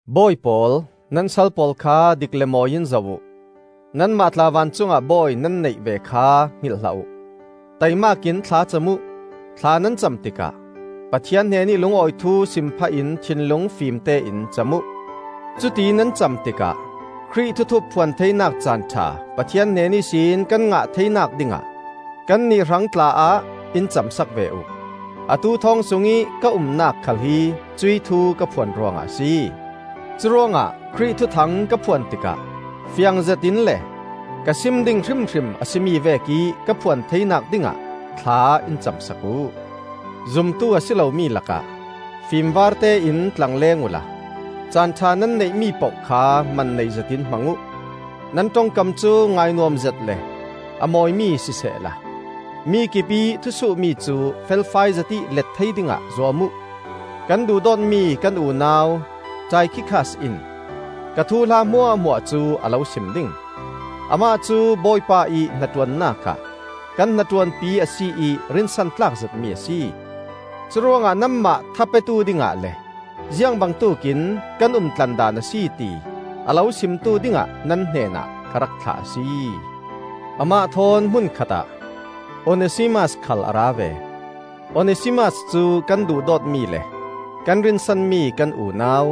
Bawi pawl, nan sal pawl kha dik le mawi in zoh uh. Nanmah tla vancungah Bawi nan neih ve kha hngilh hlah uh. Taimak in thla cam uh; thla nan cam tikah, Pathian hnenih lungawi thu sim phahin thinlung fimtein cam uh. Cuti nan cam tikah Khrih thuthup phuan theinak caan ṭha Pathian hnen ihsin kan ngah theinak dingah kannih hrang tla-ah in cam sak ve uh. Atu thawng sungih ka umnak khal hi cuih thu ka phuan ruangah a si. Curuangah Khrih Thuthang ka phuan tikah fiangzetin le ka sim ding hrimhrim a si mi vekih ka phuan theinak dingah thla in cam sak uh. Zumtu a si lomi lakah fimvartein tlangleng uhla caan ṭha nan neih mi poh kha man nei zetin hmang uh. Nan ṭongkam cu ngainuam zet le a mawimi sisehla, mi kipih thusuhmi cu felfai zetih let thei dingah zuam uh. Kan duhdawtmi kan unau Taikhikas in ka thuhla hmuahhmuah cu a lo sim ding. Amah cu Bawipa ih hnaṭuannak ah kan hnaṭuanpi a si ih rinsan tlakzetmi a si. Curuangah nanmah tha petu dingah le ziang bangtuk in kan umtlandan a si ti a lo simtu dingah nan hnenah ka rak thlah a si. Amah thawn hmun khatah Onesimas khal a ra ve. Onesimas cu kan duhdawtmi le kan rinsanmi kan unau,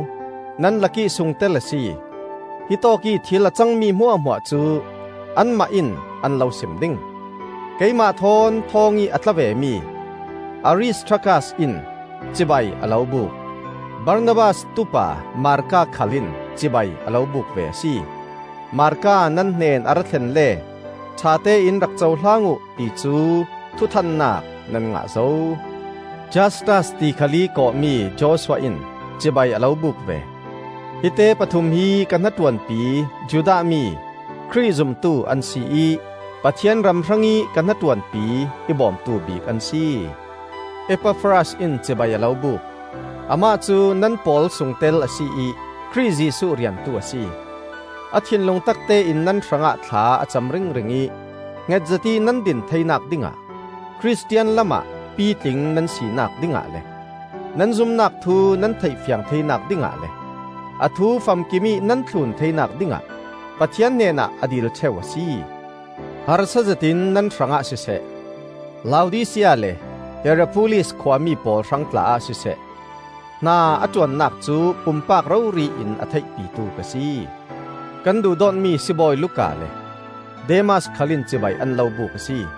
nan lakih sungtel a si. Hitawkih thil a cangmi hmuahhmuah cu anmah in an lo sim ding. Keimah thawn thawngih a tla vemi Aristarkas in cibai a lo buk; Barnabas tupa Marka khal in cibai a lo buk ve a si. (Marka nan hnen a ra thlen le ṭhatein rak cohlang uh, ti cu thuthannak nan ngah zo.) Justus ti khalih kawh mi Joshua in cibai a lo buk ve. Hi te pathum hi ka hnaṭuanpi Judah mi Khrih zumtu an si ih Pathian ram hrangih ka hnaṭuanpi, i bawmtu bik an si. Epafras in cibai a lo buk. Amah cu nan pawl sungtel a si ih Khrih Jesuh riantu a si. A thinlung taktein nan hrangah thla a cam ringring ih hngetzet ih nan din theinak dingah, Khristian lamah pitling nan sinak dingah, nan zumnak thu nan theih fiang theinak dingah le a thu famkimih nan thlun theinak dingah Pathian hnenah a dil ṭheu a si. Harsazet in nan hrangah siseh, Laodisia le Hierapolis khua mi pawl hrang tla-ah siseh, hna a ṭuannak cu pumpak rori in a theihpitu ka si. Kan duhdawtmi sibawi Luka le Demas khal in cibai an lo buk a si.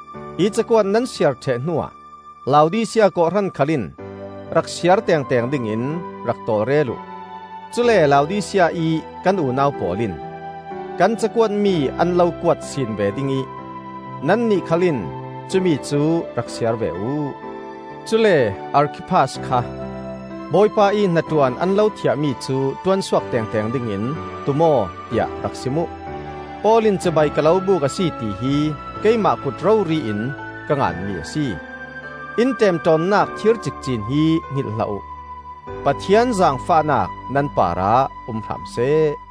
Hi cakuat nan siar ṭheh hnuah Laodisia kawhhran khal in rak siar tengteng dingin rak tawlrel uh. Cule Laodisia ih kan unau pawl in kan cakuatmi an lo kuat sin ve ding ih nannih khal in cumicu rak siar ve uh. Cule Arkhiphas kha, “Bawipa ih hnaṭuan an lo thiahmi cu ṭuansuak tengteng dingin tum aw,” tiah rak sim uh. Paul in cibai ka lo buk a si tihi keimah kut rori in ka nganmi a si. In ṭemṭawnnak thir cikcin hi hngilh hlah uh! Pathian zaangfahnak nan parah um hram seh.